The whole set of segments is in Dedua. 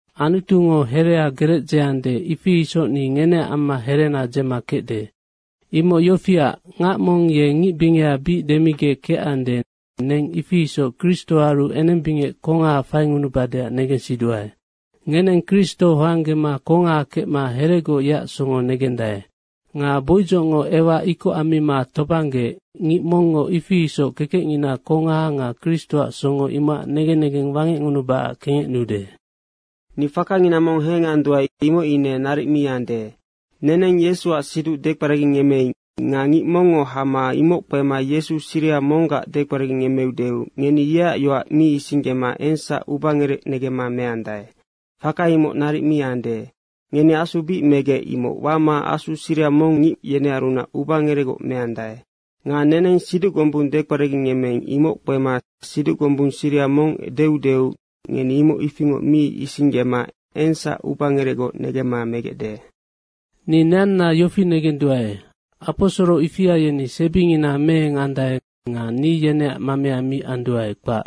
Anutungo herea gerec dzeande, ifi isoc ni ngeneac amma herena dzema kecde. Imoc yofiac, ngac mong ye ngic bingeha bic demigec kecande, neng ifi isoc Kristoaru enembingec kongaha faingunubadeac negensiduae. Ngeneng Kristo hoanggema kongaha kecma heregoc yeac songo negendae. Nga boidzocngo Ewa ikoc ammima tobanggeec, ngic mongngo ifi isoc kekecngina kongaha nga Kristoac songo imocac negen negeng wangecngunubacac kengecnude. Ni fakangina mong henganduae, imoc ine naric mi ande. Neneng Yesuac siduc dekperagingemmeing nga ngic mongngo hama imoc kpema Yesu siriha monggac dekperagingemmeudeu ngeni yeac yoac mi isinggema engsac ubangerec negemma meandae. Faka imoc naric mi ande. Ngeni Asu bic megec, imoc wama asu siriha mong ngic yenearunac ubangerecgoc meandae. Nga neneng siduc gombung dekperagingemmeing, imoc kpema siduc gombung siriha mong deudeu ngeni imoc ifingoc mi isinggema engsac ubangerecgoc negemma megecde. Ni neanna yofi negenduae, aposoro ifia yeni sebingina meengandae nga ni yeneac mamea mi anduae, kpac.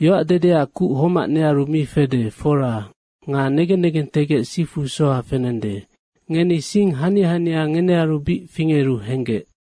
Yoac dedeac kuc homac nearu mi fede, fora. Nga negen negentegec sifu soha fenende. Ngeni sing hania hania ngenearu bic fingeru henggec.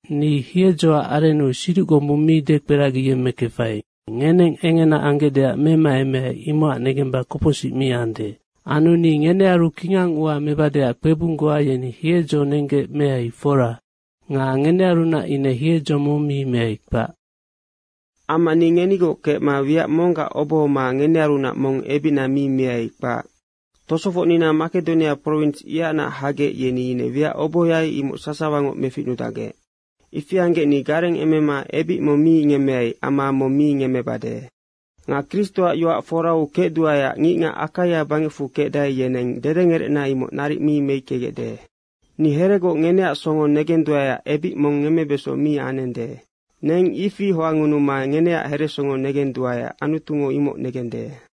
Ni hiedzoac arennu siduc gombung mi dekperagingemmekefai. Ngeneng engena anggecdeac memaemeai, imocac negemba kopocsic mi ande. Anu ni ngenearu kingang ua mebadeac kpebung goa yeni hiedzo nenggec meai, fora. Nga ngenearunac ine hiedzo mong mi meai, kpac. Amma ni ngenigoc kecma wiac monggac obohoma ngenearunac mong ebicna mi miai, kpac. Tosofocnina Makedonia prowins, ihacnac hagec, yeni ine wiac obohoai, imoc sasawangoc meficnudacgec. Ifi anggec ni garengemema ebic mong mi ngemmeai amma mong mi ngemmebade. Nga Kristoac yoac forau kecduaeac ngicngac Akaia bangecfu kecdae, yeneng dedengerecna imoc naric mi meickegecde. Ni heregoc ngeneac songo negenduaeac ebic mong ngemmebeso mi anende. Neng ifi hoangngunuma ngeneac heresongo negenduae, Anutungo imoc negende.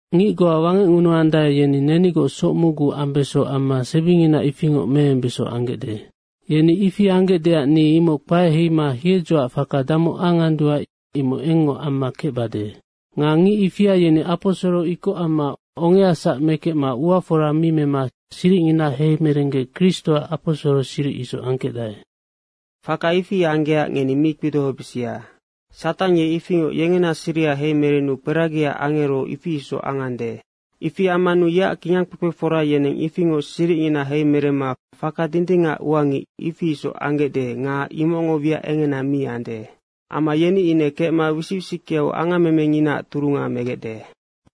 Ngic goa wangecngunuandae, yeni nenigoc soc mocgu ambeso amma sebingina ifingoc meembeso anggecde. Yeni ifi anggecdeac ni imoc kpae heima hiedzoac faka damoc anganduae, imoc engngoc amma kecbade. Nga ngic ifia yeni aposoro ikoc amma ongeasac mekecma ua fora mi mema siricngina heimerenggec Kristoac aposoro siric isoc angkecdae. Faka ifi anggecac ngeni mi kpidohobisia. Satang ye ifingoc yengena siriha heimerenu kperagiac angero, ifi isoc angande. Ifi ammanu yeac kingangkpekpefora yeneng ifingoc siricngina heimeremma faka dindingacac ua ngic, ifi isoc anggecde nga imocngo wiac engena mi ande. Amma yeni ine kecma wisic wisickeau angammemenginaac turunga megecde.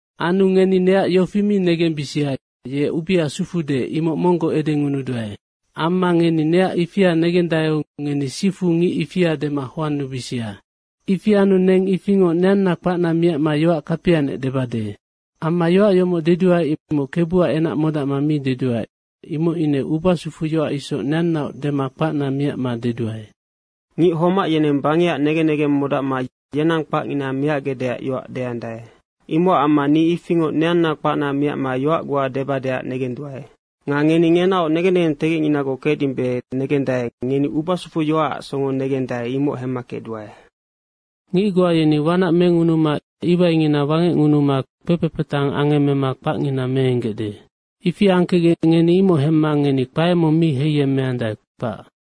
Anu ngeni neac yofi mi negembisia, “Ye ubea sufude.” imoc monggoc edengunuduae. Amma ngeni neac ifia negendaeu ngeni sifu ngic ifia dema hoannubisia. Ifi anu neng ifingoc neanna kpacna miacma yoac kapianec debade. Amma yoac yomoc deduae, imoc Kebuac enac modacma mi deduae, imoc ine ubasufuyoac isoc neannaoc dema kpacna miacma deduae. Ngic homac yeneng bangecac negen negeng modacma yenang kpacngina miacgecdeac yoac deandae. Imocac amma ni ifingoc neanna kpacna miacma yoac goa debadeac negenduae. Nga ngeni ngenaoc negen negentegecninagoc kecdimbe negendae, ngeni ubasufuyoacac songo negendae, imoc hemma kecduae. Ngic goa yeni wanac mengunuma iwaingina wangecngunuma kpekpe patang angemmema kpacngina meenggecde. Ifi angkecgec ngeni imoc hemma ngeni kpae mong mi heiyemmeandae, kpac.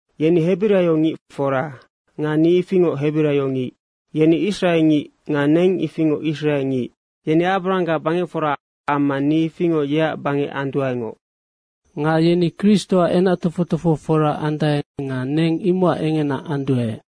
Yeni hebiraio ngic, fora. Nga ni ifingoc hebiraio ngic. Yeni Israe ngic nga neng ifingoc israe ngic. Yeni Abarahanggac bangecfora amma ni ifingoc yeac bangec anduaengoc. Nga yeni Kristoac kingangkpekpefora andae nga neng imocac engena anduae.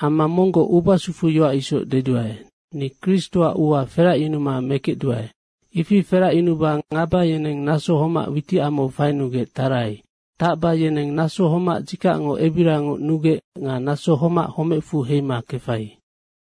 Amma monggoc ubasufuyoac isoc deduae. Ni Kristoac ua feracyunuma mekecduae. Ifi feracyunuba ngaba yeneng naso homac witicamau fainugec tarai. Tacba yeneng naso homac dzikacngo ebirangoc nugec nga naso homac homecfu heima kefai.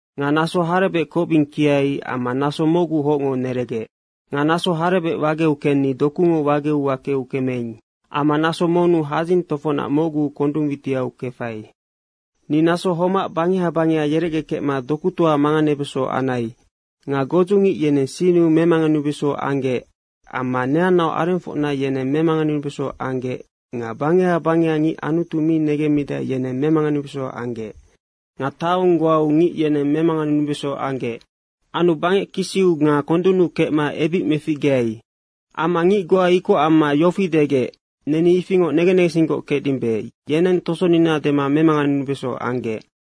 Nga naso harebec kocbing kiai amma naso mocgu hocngo neregec. Nga naso harebec wageu kenni dokungo wageu wakeu kemeing. Amma naso monnu hadzing tofocnac mocgu kondung witiau kefai. Ni naso homac bangeha bangeha yerecgekecma dokutoau manganebeso anai. Nga godzungic yeneng sinnu memanganenubeso anggec amma neanna arengfocna yeneng memanganenubeso anggec nga bangeha bangeha ngic Anutu mi negemmidae, yeneng memanganenubeso anggec. Nga taong goau ngic yeneng memanganenubeso anggec. Anu bangec kisiu nga kondunnu kecma ebic meficgeai. Amma ngic goa ikoc amma yofi degec, “Neni ifingoc negen negensinggoc kecdimbe.” yeneng tosonina dema memanganenubeso anggec.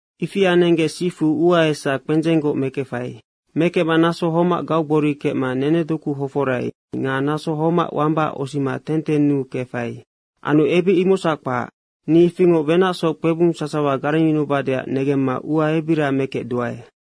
Ifi anenggec sifu ua esa kpendzenggoc mekefai. Mekecma naso homac gaugbori kecma nenedoku hoforai nga naso homac wambaac osima tentennuu kefai. Anu ebic imocsac kpac, ni ifingoc wenacsoc kpebung sasawa garengyunubadeac negemma ua ebira mekecduae.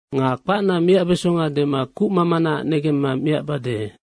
Nga kpacna miacbeso dema kucmamanaac negemma miacbade.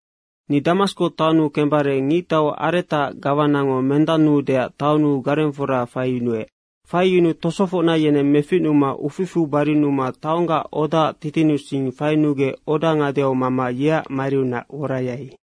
Ni Damasko taonnu kecbare ngictau Aretaac gawanango mendannuudeac taonnu garengfora faiyunuec. Faiyunuu tosofocna yeneng meficnuma uficfu barinuma taonggac odaac titinnusing fainugec oda ngadeau mama yeac mariunac worayai.